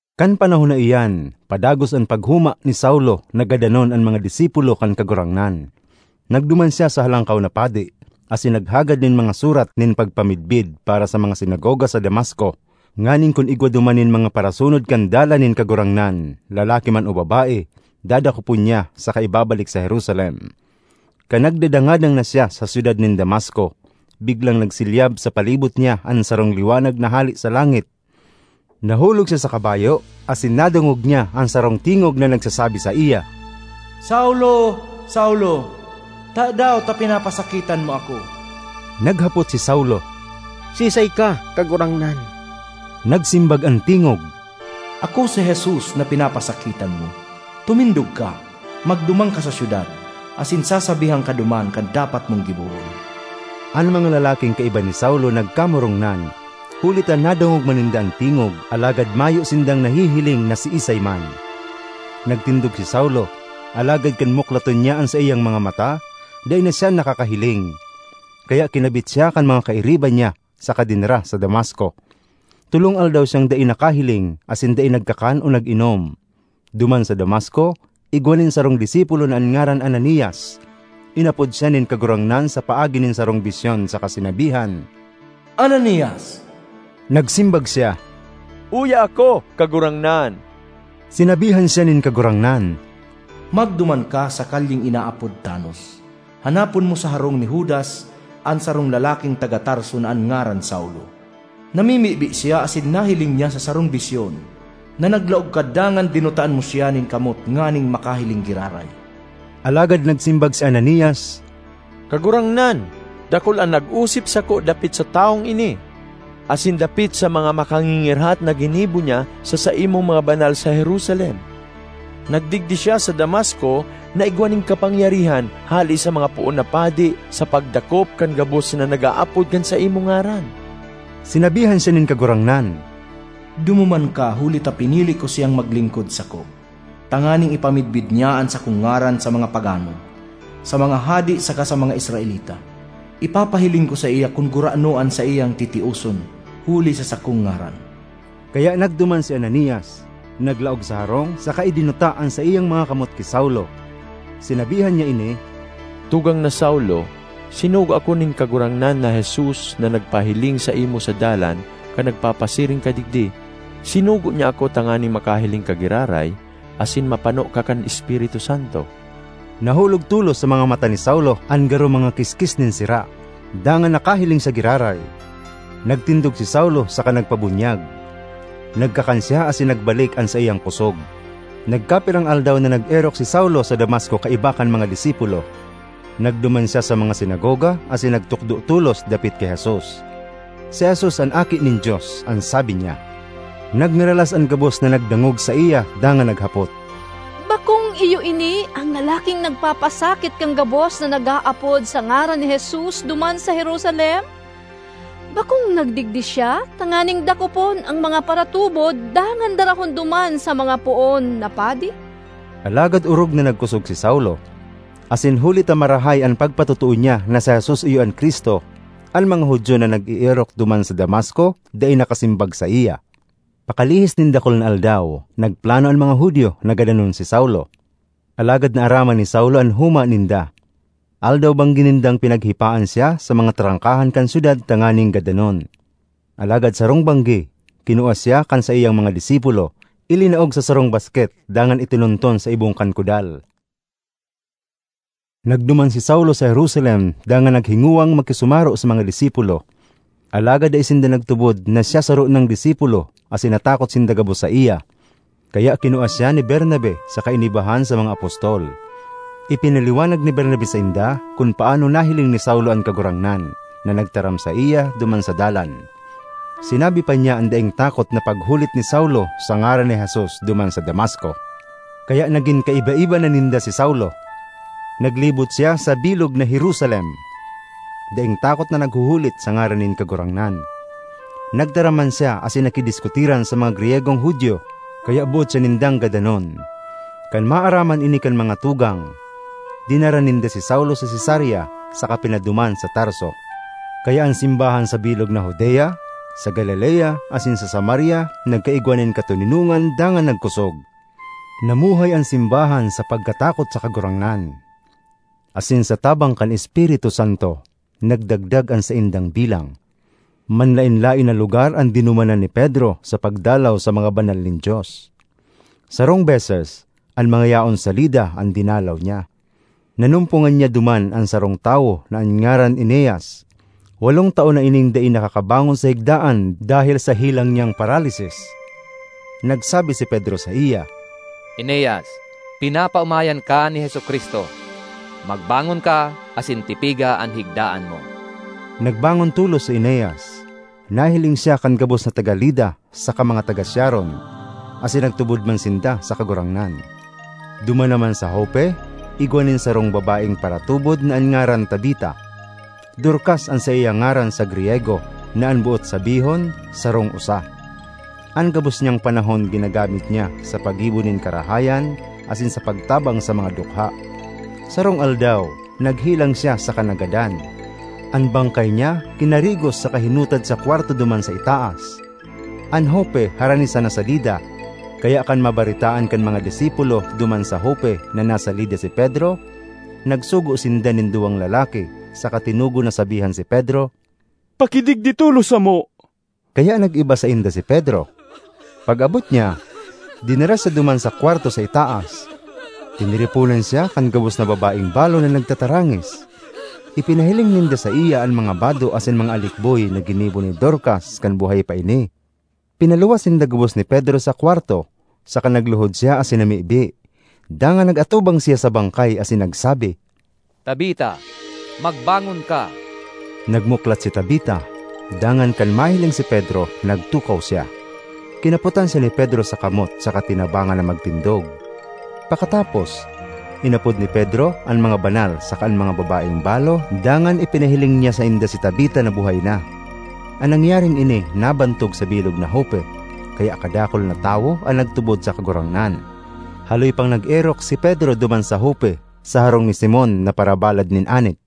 Kan panahon na iyan, padagos an paghoma ni Saulo na gadanon an mga disipulo kan Kagurangnan. Nagduman siya sa Halangkaw na Padi, asin naghagad nin mga surat nin pagpamidbid para sa mga sinagoga sa Damasco, nganing kun igwa duman nin mga parasunod kan Dalan nin Kagurangnan, lalaki man o babae, dadakopon niya saka ibabalik sa Jerusalem. Kan nagdadangadang na siya sa syudad nin Damasco, biglang nagsilyab sa palibot niya an sarong liwanag na hale sa langit. Nahulog siya sa kabayo asin nadangog niya an sarong tingog na nagsasabi saiya, “Saulo, Saulo! Tadaw ta pinapasakitan mo ako?” Naghapot si Saulo, “Siisay ka, Kagurangnan?” Nagsimbag an tingog, “Ako si Jesus na pinapasakitan mo. Tumindog ka, magduman ka sa syudad, asin sasabihan ka duman kan dapat mong gibohon.” An mga lalaking kaiba ni Saulo nagkamorongnan huli ta nadangog man ninda an tingog alagad mayo sindang nahihiling na siisay man. Nagtindog si Saulo, alagad kan muklaton niya an saiyang mga mata, dai na siya nakakahiling. Kaya kinabit siya kan mga kairiba niya saka dinara sa Damasco. Tolong aldaw siyang dai nakahiling asin dai nagkakan o nag-inom. Duman sa Damasco igwa nin sarong disipulo na an ngaran Ananias. Inapod siya nin Kagurangnan sa paagi nin sarong bisyon saka sinabihan, “Ananias!” Nagsimbag siya, “Uya ako, Kagurangnan.” Sinabihan siya nin Kagurangnan, “Magduman ka sa kalyeng inaapod Tanos; hanapon mo sa harong ni Judas an sarong lalaking taga Tarso na an ngaran Saulo. Namimibi siya asin nahiling niya sa sarong bisyon na naglaog ka dangan dinutaan mo siya nin kamot nganing makahiling giraray.” Alagad nagsimbag si Ananias, “Kagurangnan, dakul an nag-osip sako dapit sa tawong ini, asin dapit sa mga makangingirhat na ginibo niya sa saimong mga banal sa Jerusalem. Nagdigdi siya sa Damasco na igwa nin kapangyarihan hale sa mga poon na padi sa pagdakop kan gabos na nag-aapod kan saimong ngaran.” Sinabihan siya nin Kagurangnan, “Dumuman ka, huli ta pinili ko siyang maglingkod sako, tanganing ipamidbid niya an sakong ngaran sa mga pagano, sa mga hade saka sa mga Israelita. Ipapahiling ko saiya kun gurano an saiyang titioson huli sa sakong ngaran.” Kaya nagduman si Ananias, naglaog sa harong saka idinuta an saiyang mga kamot ki Saulo. Sinabihan niya ini, “Tugang na Saulo, sinugo ako nin Kagurangnan na Jesus na nagpahiling saimo sa dalan kan nagpapasiring ka digdi. Sinugo niya ako tanganing makahiling ka giraray asin mapano ka kan Espiritu Santo.” Nahulog tolos sa mga mata ni Saulo an garo mga kiskis nin sira, dangan nakahiling siya giraray. Nagtindog si Saulo saka nagpabunyag; nagkakan siya asin nagbalik an saiyang kosog. Nagkapirang aldaw na nag-erok si Saulo sa Damasco kaiba kan mga disipulo. Nagduman siya sa mga sinagoga asin nagtukdo tolos dapit ki Jesus. “Si Jesus an Aki nin Dios,” an sabi niya. Nagngaralas an gabos na nagdangog saiya dangan naghapot, “Bakong iyo ini an lalaking nagpapasakit kan gabos na nag-aapod sa ngaran ni Jesus duman sa Jerusalem? Bakong nagdigdi siya tanganing dakopon an mga paratubod dangan darahon duman sa mga poon na padi?” Alagad orog na nagkosog si Saulo, asin huli ta marahay an pagpatotoo niya na si Jesus iyo an Cristo, an mga Judio na nag-eerok duman sa Damasco dai nakasimbag saiya. Pakalihis nin dakul na aldaw, nagplano an mga Judio na gadanon si Saulo. Alagad naaraman ni Saulo an homa ninda. Aldaw-banggi nindang pinaghipaan siya sa mga trangkahan kan syudad tanganing gadanon. Alagad sarong banggi, kinua siya kan saiyang mga disipulo, ilinaog sa sarong basket dangan itinunton sa ibong kan kudal. Nagduman si Saulo sa Jerusalem dangan naghingowang makisumaro sa mga disipulo. Alagad dai sinda nagtubod na siya saro nang disipulo asin natakot sinda gabos saiya. Kaya kinua siya ni Bernabe saka inibahan sa mga apostol. Ipinaliwanag ni Bernabe sainda kun paanong nahiling ni Saulo an Kagurangnan, na nagtaram saiya duman sa dalan. Sinabi pa niya an daing takot na paghulit ni Saulo sa ngaran ni Jesus duman sa Damasco. Kaya nagin kaiba-iba na ninda si Saulo. Naglibot siya sa bilog na Jerusalem, daing takot na naghuhulit sa ngaran nin Kagurangnan. Nagtaram man siya asin nakidiskutiran sa mga Griyegong Judio; kaya boot siya nindang gadanon. Kan maaraman ini kan mga tugang, dinara ninda si Saulo sa Cesarea saka pinaduman sa Tarso. Kaya an simbahan sa bilog na Judea, sa Galilea asin sa Samaria nagkaigwa nin katoninongan dangan nagkosog. Namuhay an simbahan sa pagkatakot sa Kagurangnan; asin sa tabang kan Espiritu Santo, nagdagdag an saindang bilang. Manlaen-laen na lugar an dinumanan ni Pedro sa pagdalaw sa mga banal nin Dios. Sarong beses, an mga yaon sa Lida an dinalaw niya. Nanumpongan niya duman an sarong tawo na an ngaran Eneas. Walong taon na ining dai nakakabangon sa higdaan dahel sa helang niyang paralisis. Nagsabi si Pedro saiya, “Eneas, pinapaomayan ka ni Jesu-Cristo. Magbangon ka asin tipiga an higdaan mo.” Nagbangon tolos si Eneas. Nahiling siya kan gabos na taga Lida saka mga taga Sharon; asin nagtubod man sinda sa Kagurangnan. Duman naman sa Jope, igwa nin sarong babaeng paratubod na an ngaran Tabita. (Dorcas an saiyang ngaran sa Griyego, na an boot sabihon, “sarong usa.”) An gabos niyang panahon ginagamit niya sa paggibo nin karahayan asin sa pagtabang sa mga dukha. Sarong aldaw, naghelang siya saka nagadan. An bangkay niya kinarigos saka hinutad sa kwarto duman sa itaas. An Jope harani sana sa Lida, kaya kan mabaretaan kan mga disipulo duman sa Jope na nasa Lida si Pedro, nagsugo sinda nin duwang lalaki saka tinugon na sabihan si Pedro, “Pakidigdi tolos samo.” Kaya nag-iba sainda si Pedro. Pag-abot niya, dinara siya duman sa kwarto sa itaas. Tiniriponan siya kan gabos na babaeng balo na nagtatarangis; ipinahiling ninda saiya an mga bado asin mga alikboy na ginibo ni Dorcas kan buhay pa ini. Pinaluwas sinda gabos ni Pedro sa kwarto, saka nagluhod siya asin namibi. Dangan nag-atubang siya sa bangkay asin nagsabi, “Tabita, magbangon ka!” Nagmuklat si Tabita, dangan kan mahiling si Pedro, nagtukaw siya. Kinapotan siya ni Pedro sa kamot saka tinabangan na magtindog. Pakatapos, inapod ni Pedro an mga banal saka an mga babaeng balo dangan ipinahiling niya sainda si Tabita na buhay na. An nangyaring ini nabantog sa bilog na Jope, kaya kadakul na tawo an nagtubod sa Kagurangnan. Haloy pang nag-erok si Pedro duman sa Jope, sa harong ni Simon na parabalad nin anit.